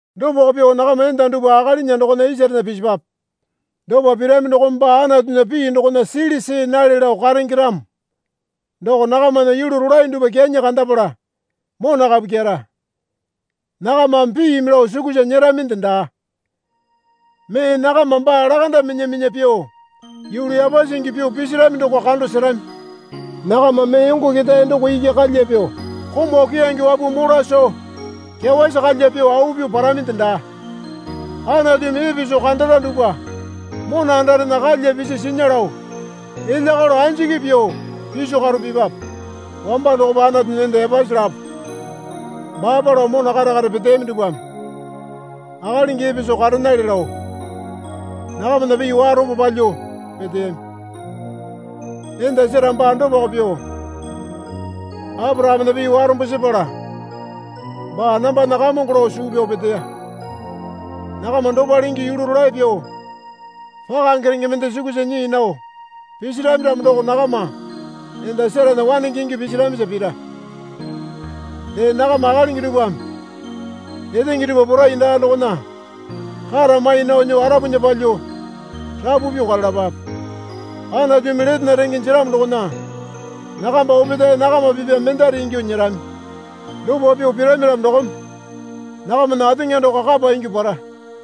Dopako pyuo nakama enda dupwa akalinya dokona isarena pisipwape. Dopa pirami dokome baa Anatunya pii dokona sili see nale lao karenge ramo doko nakamana yulu rolae dupwa kyanyi kandapala mona kapu kyera. Nakamame piimi lao sukusa nyeraminde daa. Mee nakama baa lakanda minya minya pyuo yulu yapasi ingyuo pyuo pisirami doko kando serami. Nakama mee yongo ketae doko iki kalya pyuo komau keyange wapuo mola soo kyawasi kalya pyuo au pyuo paraminde daa. Anatumi epe soo kandara dupwa mona andarena kalya pisi sinya lao elya kalo anjiki pyuo piso karo pipape. Wamba dokopa Anatunya enda yapasi lapo baapa lao mona kare kare peteyami dupwame akalingi epe soo karenale lao nakamana pii warombo palyuo peteyami. Enda Sera baa dopako pyuo Aporakamena pii warombo sepala baa, Nambana kamongo lao suu pyao peteya. Nakama dopale ingyuo yulu rolae pyuo pakange renge mende sukusa nyii nao pisirami ramo doko nakama enda Serana wanenge ingyuo pisiramisa pira. Dee nakama akalingi dupwame etenge dupwa porai daa dokona kata mai nao nyuo arapunya palyuo rapu pyuo karalapape. Anatumi letena renge jeramo dokona nakamba opetae nakama pipya mendare ingyuo nyerami. Dopa pyuo pirami ramo dokome nakamana ateŋa doko kapa ingyuo para.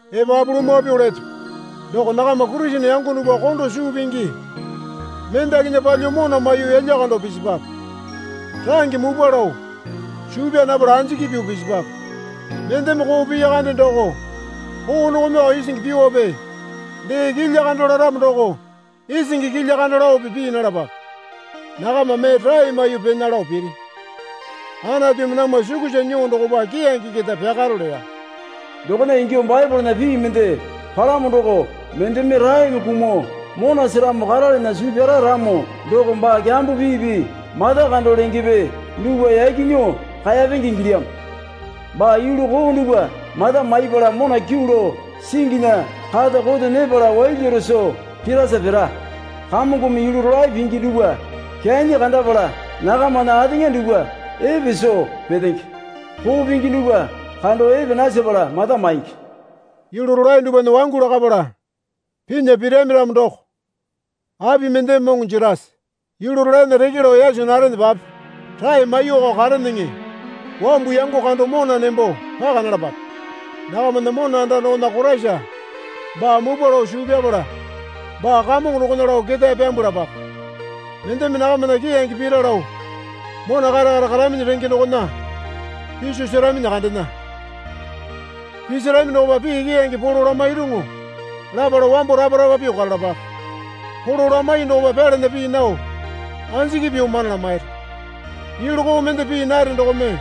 Epapu lumwa pyuo leto. Doko nakama Kurisene yango dupwa kondo suu pingi mendakinya palyuo mona maiyuo yalya kando pisipwape. Range mupwa lao suu pyaa napala anjiki pyuo pisipwape. Mendeme koo piya kande doko koo dokomeko isingi pyuope dee kilya kando laramo doko isingi kilya kando laope pii nalapape. Nakama mee rae maiyuo pena lao piri. Anatumi namwa sukusa nyuo dokopa keyange keta pyakaro leya. Dokona ingyuo Baepolena pii mende palamo doko, Mendeme raeme kumuo mona seramo karalana suu pyara ramo doko baa kyambo piipi mata kando lengepe dupwa yaki nyuo kaeyapenge ingilyamo. Baa yulu koo dupwa mata maipala mona kyuu lao singinya kata koto nyepala wailyaro soo pirasa pira. Kamongome yulu rolae pingi dupwa kyanyi kandapala nakamana ateŋa dupwa epe soo petenge. Koo pingi dupwa kando epe nasepala mata maingi. Yulu rolae dupwana wangu lakapala pinya pirami ramo doko api mendeme moŋo jerase? Yulu rolaena reke lao yaso narenepape rae maiyuoko kareneŋe. Wambu yango kando mona nembo paka nalapape. Nakamana mona anda dokona Koraisa baa mupwa lao suu pyapala baa Kamongo dokona lao ketae pyambwalapape. Mendeme nakamana keyange pira lao mona kare kare karaminyi renge dokona piso seraminyi kandena. Pisarami dokopa pii keyange polo lamairuŋu lapala wambo rapa rapa pyuo karalapape. Polo lamaiyuo dokopa pyalana pii nao anjiki pyuo mana lamairi. Yulu koo mende pii nare dokome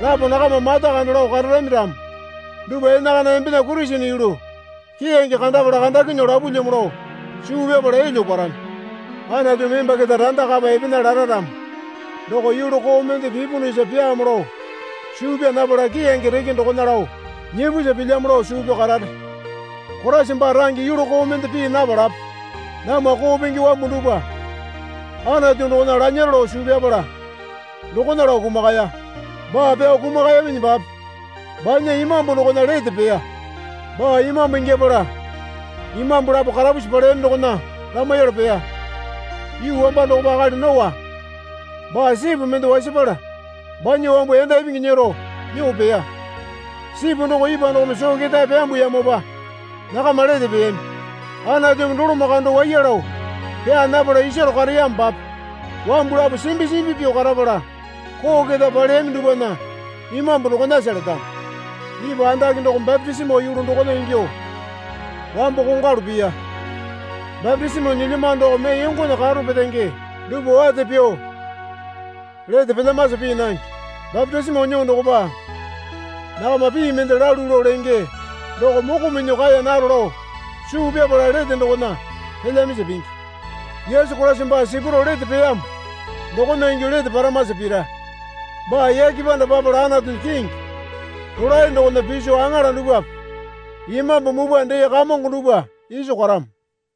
lapo nakama mata kando lao kararami ramo dupwa enakana embena Kurisene yulu keyange kandapala kandakinyuo lapulyamo lao suu pyapala elyuo parami. Anatumi emba keta randa kapa epena lara ramo doko yulu koo mende pipunusa pyaamo lao suu pyaa napala keyange reke dokona lao nyipusa pilyamo lao suu pyao karare. Koraisa baa range yulu koo mende pii napalape namwa koo pingi wambu dupwa Anatu dokona lanyaro lao suu pyapala dokona lao kumakaya. Baa pyuo kumakayaminyipape banya imambu dokona lete peya. Baa imambu ingyapala imambu lapo karapusi paleyami dokona lamaiyala peya. Yuu wamba dokopa akali Noa baa sipu mende wasapala banya wambu yanda ipingi nyero nyuo peya. Sipu doko ipwa dokome soo ketae pyambuyamopa nakama lete peyami. Anatumi doloma kando waiya lao pyaa napala isaro kareyamopape wambu lapo simbi simbi pyuo karapala koo keta paleyami dupwana imambu dokonasa letamo. Ipwa andake doko bapitisimo yulu dokona ingyuo wambo kongwalu piya. Bapitisimo nyilyamano doko mee yongona karo petenge dupwa wate pyuo lete pelyamasa pii nange. Bapitisimo nyuo dokopa nakama pii mende lalu lao lenge doko moko minyuo kaeya naro lao suu pyapala lete dokona pelyamasa pingi. Yesu Koraisa baa sipurao lete peyamo dokona ingyuo lete paramasa pira. Baa yake panda papala Anatunya kingi rolae dokona piso aŋala dupwape imambu mupwa, dee kamongo dupwa iso karamo.